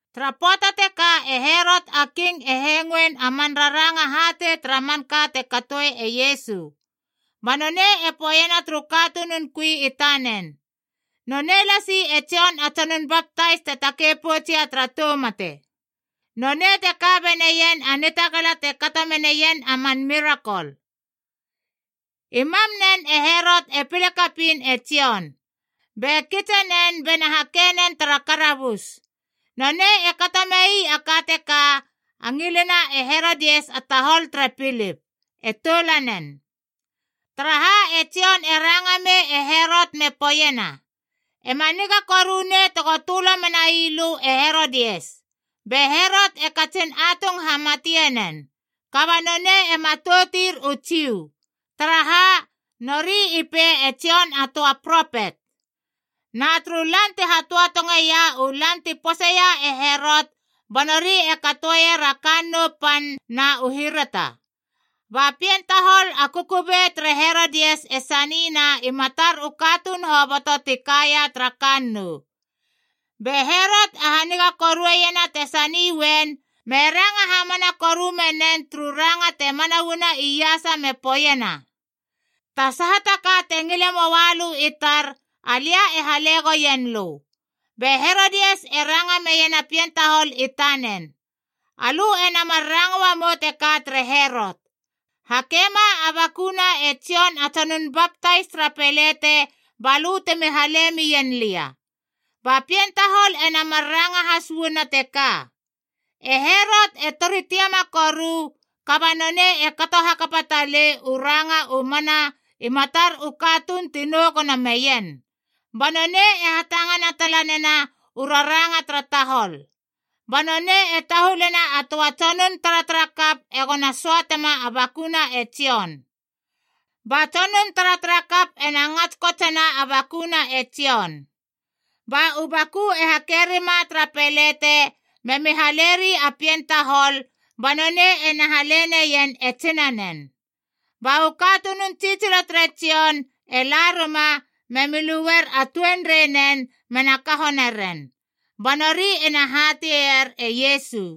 Tara pöata teka e Herot a King e hengoen a man raranga hatei tara manka te katoe e Iesu. Ba nonei e poeiena turu katunun kui i tanen, “Nonei lasi e Jon a Tsonun Baptais te takei poutsia tara tou mate. Nonei te ka beneien a nitagala te kato meneien a man mirakol.” I mam nen e Herot e pile kapiin e Jon, be kitsenen bena hakenen tara karabus. Nonei e kato mei a ka teka a ngilina e Herodias a tahol tere Pilip, e toulanen. Taraha e Jon e ranga mei e Herot me poeiena, “E ma niga koru nei tego tölo menai lö e Herodias!” Be Herot e katsin atung hamatie nen, kaba nonei e matoutir u Jiu. Taraha, nori i pei e Jon a töa propet. Na turu lan ti hatöatongeia u lan ti poseia e Herot ba nori e katoeier a kannou pan na u hirata, ba pien tahol a kukubei tere Herodias e sanina i matar u katuun hoboto ti kaia tara kannou. Be Herot e haniga korueiena te sani uen, me ranga hamana koru menen turu ranga te mana uana iasa me poeiena, “Ta saha ta ka te ngile moa lö i tar, alia e hale goien lö!” Be Herodias e ranga meiena a pien tahol i tanen, “Alö ena mar ranga uamou teka tere Herot, ‘Hakema a bakuna e Jon a Tsonun Baptais tara pelete ba lö temi hala mien lia.’” Ba pien tahol ena mar ranga has uana teka. E Herot e tori tiama koru, kaba nonei e kato hakapa talei u ranga u mana i matar u katuun ti nou gono meien, ba nonei e hatangana tala nena u raranga tara tahol. Ba nonei e tahulena a töa tsonun taratarakap egona söatema a bakuna e Jon. Ba tsonun taratarakap ena ngats kotsena a bakuna e Jon. Ba u baku e hake rima tara pelete me haleri a pien tahol, ba nonei ena hale neien e tsinanen. Ba u katunun tsitsilo tere Jon e la rima, me luer a tuenreinen mena kaho naren. Ba nori ena hateier e Iesu.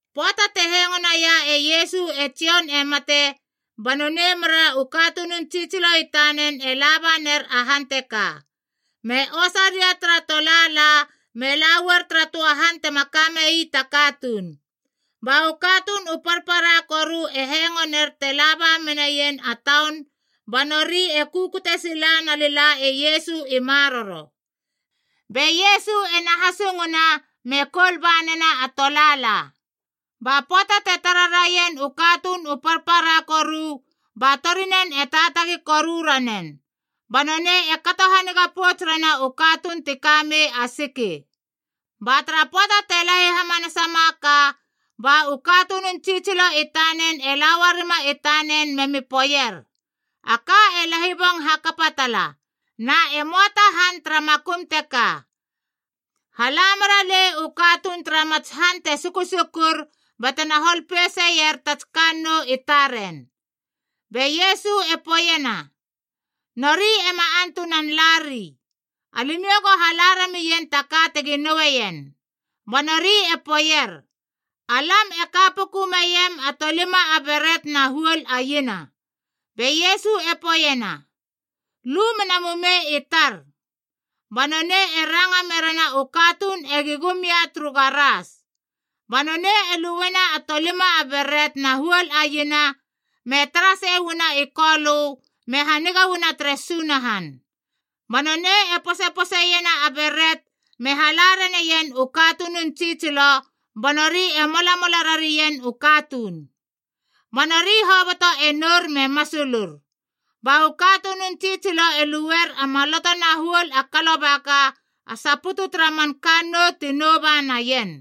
Pöata te hengo naia e Iesu e Jon e mate, ba nonei mera u katunun tsitsilo i tanen e la ba ner a han teka, me osa ria tara tolaala me la uar tara töa han tema kame ii ta katuun. Ba u katuun u parpara koru e hengoner te la ba meien a taun ba nori e kukute sila nalila e Iesu i maroro. Be Iesu ena hasunguna me koul ba nena a tolaala. Ba pöata te tara raien u katuun u parpara koru, ba torinen e taatagi koru ranen, ba nonei e kato haniga pouts rena u katuun ti kamei a siki. Ba tara pöata te lahi hamanasama ka ba u katunun tsitsilo i tanen e la uarima i tanen memi poeier, “A ka e lahibong hakapa tala, na e möa ta han tara makum teka. Hala mera lei u katuun tara matsi han te sukusukur batena hol peiseier ta kannou i taren.” Be Iesu e poeiena, “Nori ema antunan lari. Alimiou go hala ramien ta ka tegi nouen.” Ba nori e poeier, “Alam e ka puku meiem a tolima a beret na huol a iena.” Be Iesu e poeiena, “Lu mena mumei i tar.” Ba nonei e ranga merena u katuun egi gum ia turu garas. Ba nonei e luena a tolima beret na huol a iena, me tara sei uana i Kolö, me haniga uana tere Sunahan. Ba nonei e posepose iena a beret me hala raneien u katunun tsitsilo, ba nori e molamola rarien u katuun. Ba nori hoboto e nour me masulur. Ba u katunun tsitsilo e luer a maloto na huol a kalobaka a saputu tara man kannou ti nouba naien.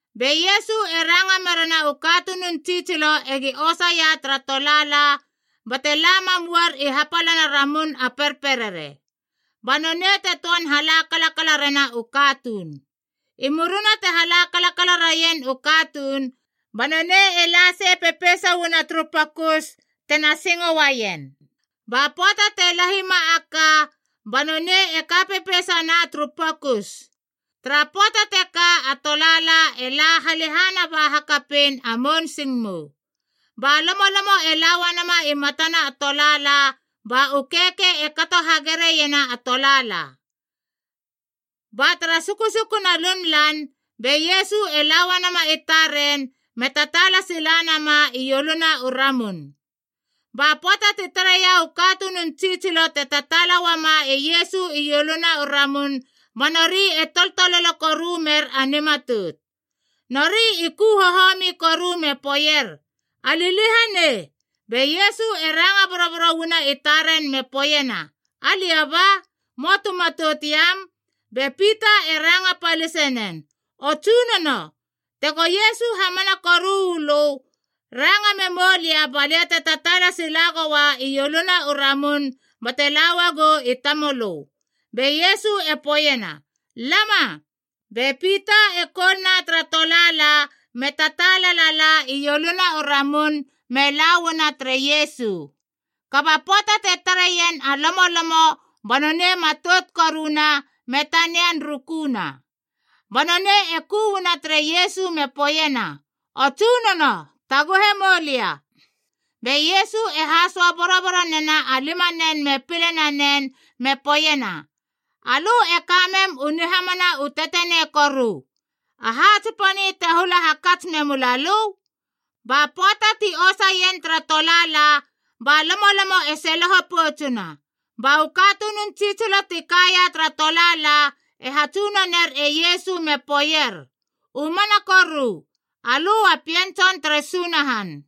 Be Iesu e ranga merena u katunun tsitsilo egi osaia tara tolaala, bate la mam uar i hapalana ramun a perperere, ba nonei te töan hala kalakala rena u katuun. I murina te hala kalakala raien u katuun, ba nonei e la sei pepeisa uana turu pokus tena singo uaien. Ba pöata te lahima a ka, ba nonei e ka pepeisana turu pokus. Tara pöata teka a tolaala e la halehana ba hakapein a mounsingmou, ba lomolomo e la uanama i matana a tolaala ba u keikei e kato hagigere iena a tolaala. Ba tara sukusukuna lunlan, be Iesu e la uanama i taren me tataala silanama ioluna u ramun. Ba pöata ti tareia u katunun tsitsilo te tataala uama e Iesu ioluna u ramun, ba nori e toltololo koru mer a nimatout. Nori i ku hohomi koru me poeier, “A liliahanei!” Be Iesu e ranga boroboro uana i taren me poeiena, “Alia ba. Möa tu matout iam!” Be Pita e ranga palisenen, “O Tsunono, tego Iesu hamana koru u lö, ranga memoulia balia te tataala sila goa ioluna u ramun bate la uagou i tamölö.” Be Iesu e poeiena, “Lama!” Be Pita e koulna tara tolaala me tataala lala ioluna u ramun me lauana tere Iesu. Kaba pöata te tareien a lomolomo ba nonei e matout koruna, me tanian rukuna. Ba nonei e ku uana tere Iesu me poeiena, “O Tsunono, taguhe moulia!” Be Iesu e hasöa boroboro nena a limanen me pile nanen me poeiena, “Alö e kamem u nihamana u tetenei koru! Aha tsiponi te hula hakats memulalö?” Ba pöata ti osaien tara tolaala, ba lomolomo e seloho poutsuna. Ba u katunun tsitsilo ti kaia tara tolaala e hatsunoner e Iesu me poeier, “U mana koru, alö a Pien Tson tere Sunahan!”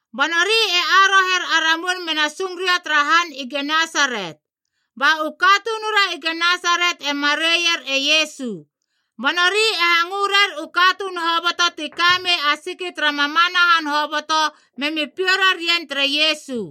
Ba nori e aroher a ramun mena sung ria tara han i Genesaret, ba u katunura i Genesaret e mareier e Iesu. Ba nori e hangö rer u katuun hoboto ti kamei a siki tara mamana han hoboto memi piou rarien tere Iesu.